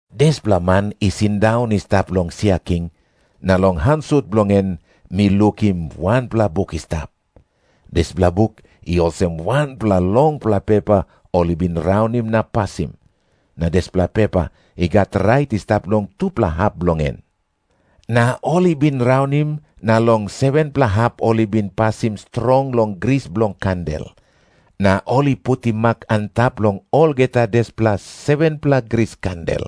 Dispela Man i sindaun i stap long sia king, na long han sut bilong en mi lukim wanpela buk i stap. Dispela buk i olsem wanpela longpela pepa ol i bin raunim na pasim, na dispela pepa i gat rait i stap long tupela hap bilong en. Na ol i bin raunim na long 7-pela hap ol i bin pasim strong long gris bilong kandel na ol i putim mak antap long olgeta dispela 7-pela gris kandel.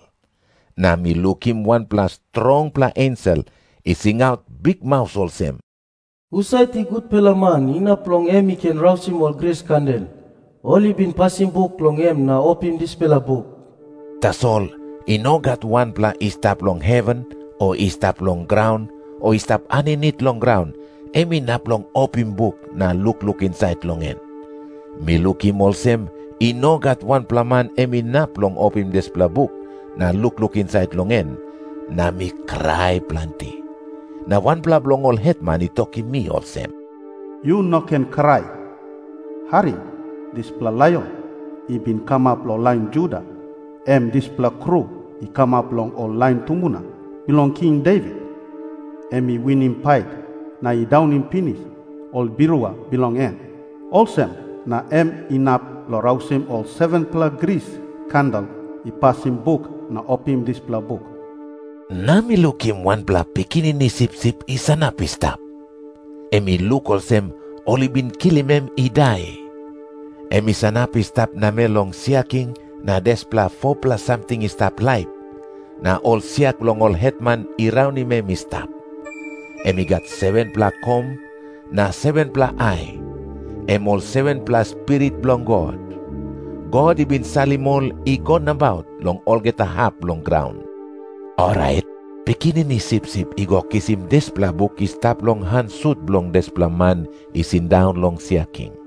Na mi lukim wanpela strongpela ensel i singaut bikmaus olsem, “Husat i gutpela man, inap long em i ken rausim ol gris kandel ol i bin pasim buk long en na opim dispela buk?” Tasol i no gat wanpela i stap long heven o i stap long graun o i stap aninit long graun, em inap long opim buk na lukluk insait long en. Mi lukim olsem i no gat wanpela man em inap long opim dispela buk na lukluk insait long en, na mi krai planti. Na wanpela bilong ol hetman i tokim mi olsem, “Yu no ken krai. Harim. Dispela Laion i bin kamap long lain Juda, em dispela Kru i kamap long ol lain tumbuna bilong King Devit, em i winim pait na i daunim pinis ol birua bilong en. Olsem na em inap long rausim ol 7-pela gris kandel i pasim buk na opim dispela buk.” Na mi lukim wanpela Pikinini Sipsip i sanap i stap. Em i luk olsem ol i bin kilim em i dai. Em i sanap i stap namel long sia king na dispela 4-pela samting i stap laip, na ol sia bilong ol hetman i raunim em i stap. Em i gat 7-pela kom na 7-pela ai, em ol 7-pela spirit bilong God. God i bin salim ol i go nabaut long olgeta hap bilong graun. Orait Pikinini Sipsip i go kisim dispela buk i stap long han sut bilong dispela Man i sindaun long sia king.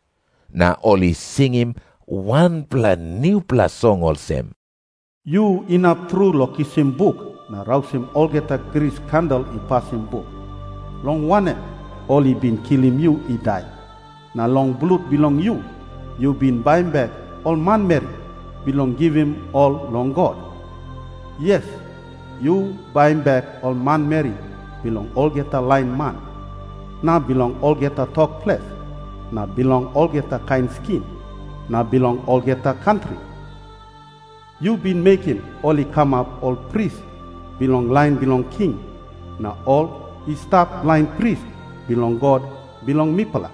Na ol i singim wanpela nupela song olsem, “Yu inap tru long kisim buk na rausim olgeta gris kandel i pasim buk. Long wanem, ol i bin kilim yu i dai, na long blut bilong yu yu bin baim bek ol manmeri, bilong givim ol long God. Yes, yu baim bek ol manmeri bilong olgeta lain man, na bilong olgeta tok ples, na bilong olgeta kain skin, na bilong olgeta kantri. Yu bin mekim ol i kamap ol pris bilong lain bilong king, na ol i stap lain pris bilong God bilong mipela.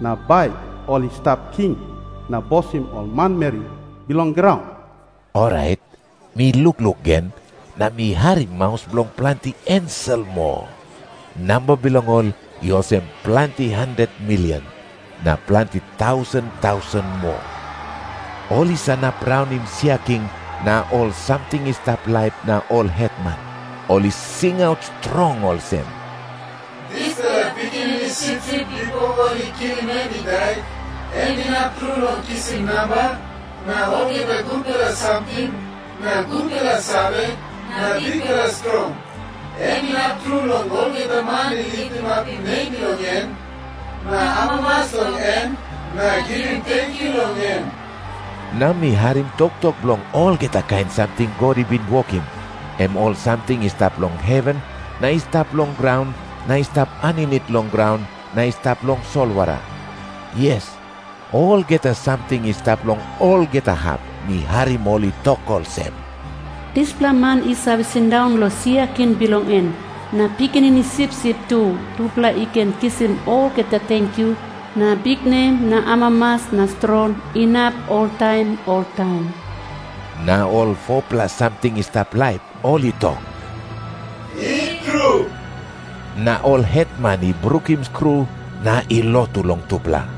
Na bai ol i stap king na bosim ol manmeri bilong graun.” Orait, mi lukluk gen, na mi harim maus bilong planti ensel moa. Namba bilong ol i olsem planti handet milion, na planti tausen tausen moa. Ol i sanap raunim sia king na ol samting i stap laip na ol hetman. Ol i singaut strong olsem, “Dispela Pikinini Sipsip bipo ol i kilim em i dai, em inap tru long kisim namba na olgeta gutpela samting na gutpela save na bikpela strong. Em inap tru long olgeta man i litimapim nem bilong em na amamas long em na givim tenkyu long em.” Na mi harim toktok bilong olgeta kain samting God i bin wokim, em ol samting i stap long heven na i stap long graun na i stap aninit long graun na i stap long solwara. Yes, olgeta samting i stap long olgeta hap, mi harim ol i tok olsem, “Dispela Man i save sindaun long sia king bilong en, na Pikinini Sipsip tu, tupela i ken kisim olgeta tenkyu na biknem na amamas na strong, inap oltaim oltaim.” Na ol 4-pela samting i stap laip ol i tok, “I tru.” Na ol hetman i brukim skru na i lotu long tupela.